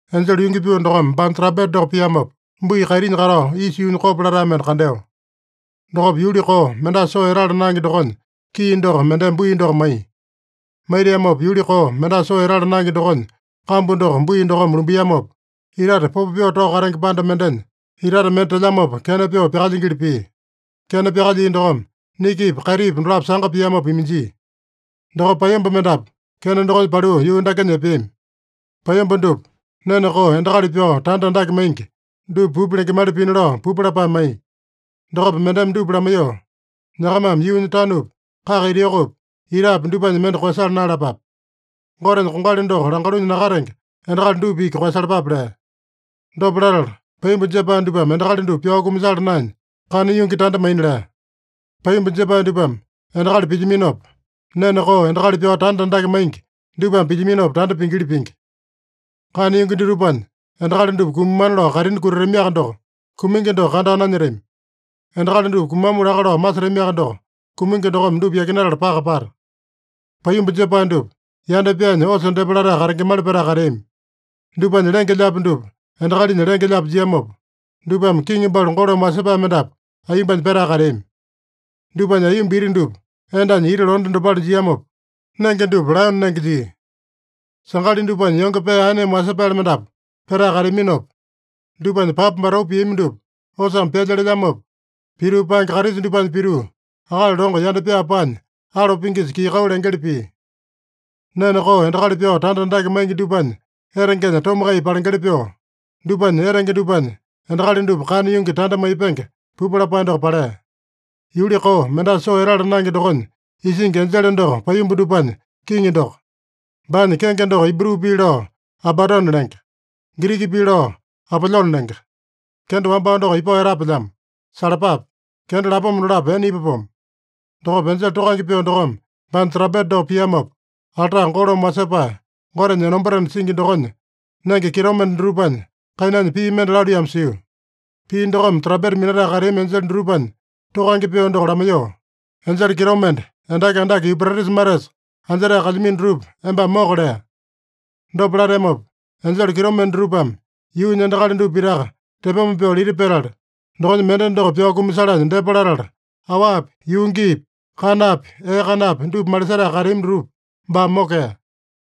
Enjele yungi pyoo dokome baanya trampeta doko piamopa, bui kaitinya katao isa yuunya kopo latae mende kandeo. Dokopa yuli koo, mendasa soo etala naenge dokonya kii doko mendeme bui doko maiya. Maitiamopa yuli koo, mendasa soo etala naenge dokonya kambu doko bui dokome lumbiamopa, itate popo pyoo tao katenge panda mendenya itate mende telyamopa kena pyoo pyakalyingili pia. Kena pyakalyia dokome nikipa, kaitipa dolapo sanga piamopa iminjia. Dokopa paiyomba mendapu kena dokonya paliu yuu dakenya epeami. Paiyomba dupa, nene koo endakali pyao tanda andake maingi dupa pupu lengemali pina lao pupu lapae maiya. Dokopa mendeme dupa lamaiyoo, “Nyakamame yuunya tanupi, kaka ita yokopi, itapi dupanya mende koeyasala naeyalapape. Gotenya kongali doko langalunya nakatenge endakali dupa iki koeyasalapape” lea. Dopa latala paiyomba jepae dupame endakali dupa pyao kumasala naenya, kana yungi tanda maina lea. Paiyomba jepae dupame endakali pilyaminopa, nene koo endakali pyao tanda andake maingi dupame pilyaminopa tanda pingili pingi. Kana yungi dutupanya endakali dupa kumamana lao kaitini kutatamiaka doko, kumingi doko kandao nanyetami. Endakali dupa kumamu laka lao masetamiaka doko, kumingi dokome dupa yakinatala paka pata. Paiyomba jepae dupa, yanda pyaanya osa depa latae katengemali petae kateami. Dupanya lenge-lyaapi dupa endakalinya lenge-lyaapi jiamopa, dupame kiŋi balu golome wasepae mendapu aiyombanya petae kateami. Dupanya aiyomba iti dupa endanya iti londe dopale jiamopa, nenge dupa laeyone nenge jia. Sangali dupanya yonge pee aeneme wasepaele mendapu petae kateaminopa, dupanya papa batau piami dupa, osame pyalya lelyamopa, pituu paenge karisa dupanya pituu, akali longo yanda pyaa paanya alo pingisa kii-kau lengeli pia. Nene koo endakali pyao tanda andake maingi dupanya etengenya tomakai palengeli pyoo, dupanya etenge dupanya endakali dupa kana yungi tanda maipenge pupu lapae doko palea. Yuli koo, mendasa soo etala naenge dokonya isingi enjele doko paiyomba dupanya kiŋi doko. Baanya kenge doko Ibru pii lao Abadone lenge. Giriki pii lao Apolyone lenge. Kenda wambao doko ipao etapelyamo. Salapape! Kenda lapoma dolapo ene ipapomo. Dokopa enjele tokange pyoo dokome baanya trampeta doko piamopa, alta golome wasepae Gotenya enombatena singi dokonya nenge kitomende dutupanya kainanya pii mende laluiyamo sio. Pii dokome trampeta minatae kateami enjele dutupanya tokange pyoo doko lamaiyoo, “Enjele kitomende, endaki andake Yupretisa matesa anjetae kalyamino dutupa embame moka” lea. Dopa lateamopa, enjele kitomende dutupame yuunya endakali dupa pitaka tepoma pyoo lita petala, dokonya mende doko pyao kumasalanya depa latala, awapi, yuu giipi, kanapi, ee kanapi, dupa malisetae kateami dutupa baame mokea.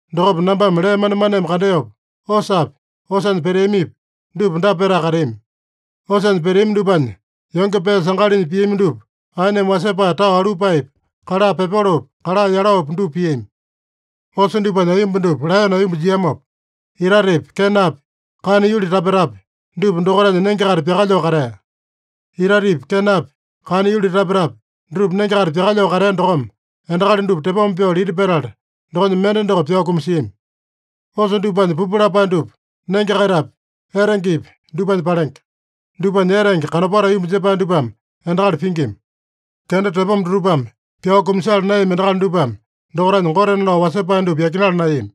Dokopa nambame lee manemaneme kandeopa, osapi, osanya peteamipi, dupa dapa petae kateami: Osanya peteami dupanya yonge pee sangalinya piami dupa aeneme wasepae tao alupaepi, kala pepolopi, kala yelopi, dupa piami. Osa dupanya aiyomba dupa laeyone aiyomba jiamopa, itatepi, kenapi, kana yuli tapetapi, dupa dokaitanya nenge-kaita pyakalyoo katea. Itatepi, kenapi, kana yuli tapetapi, dutupa nenge-kaita pyakalyoo katea dokome endakali dupa tepoma pyoo lita petala, dokonya mende doko pyao kumasiami. Osa dupanya pupu lapae dupa nenge-kaitapi, etengepi dupanya palenge. Dupanya etenge kanopato aiyomba jepae dupame endakali pingima. Kenda tepoma dutupame pyao kumasala naeyami endakali dupame dokaitanya gotena lao wasepae dupa yakinala naeyami.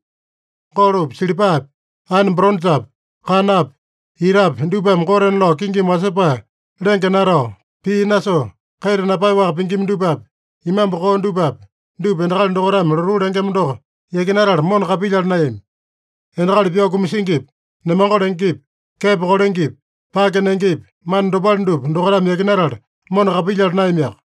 Golopi, silipapi, aene boronjapi, kanapi, itapi dupame gotena lao kingimi wasepae lenge natao, pii nasoo, kaita napaeyaowaka pingima dupapi, imambu koo dupapi, dupa endakali dokaitame lotuu lengema doko yakinatala mona kapilyala naeyami. Endakali pyao kumasingipi, nemango lengepi, kepo kolengepi, pake nengepi, mana dopale dupa dokaitame yakinatala, mona kapilyala naeyamiaka.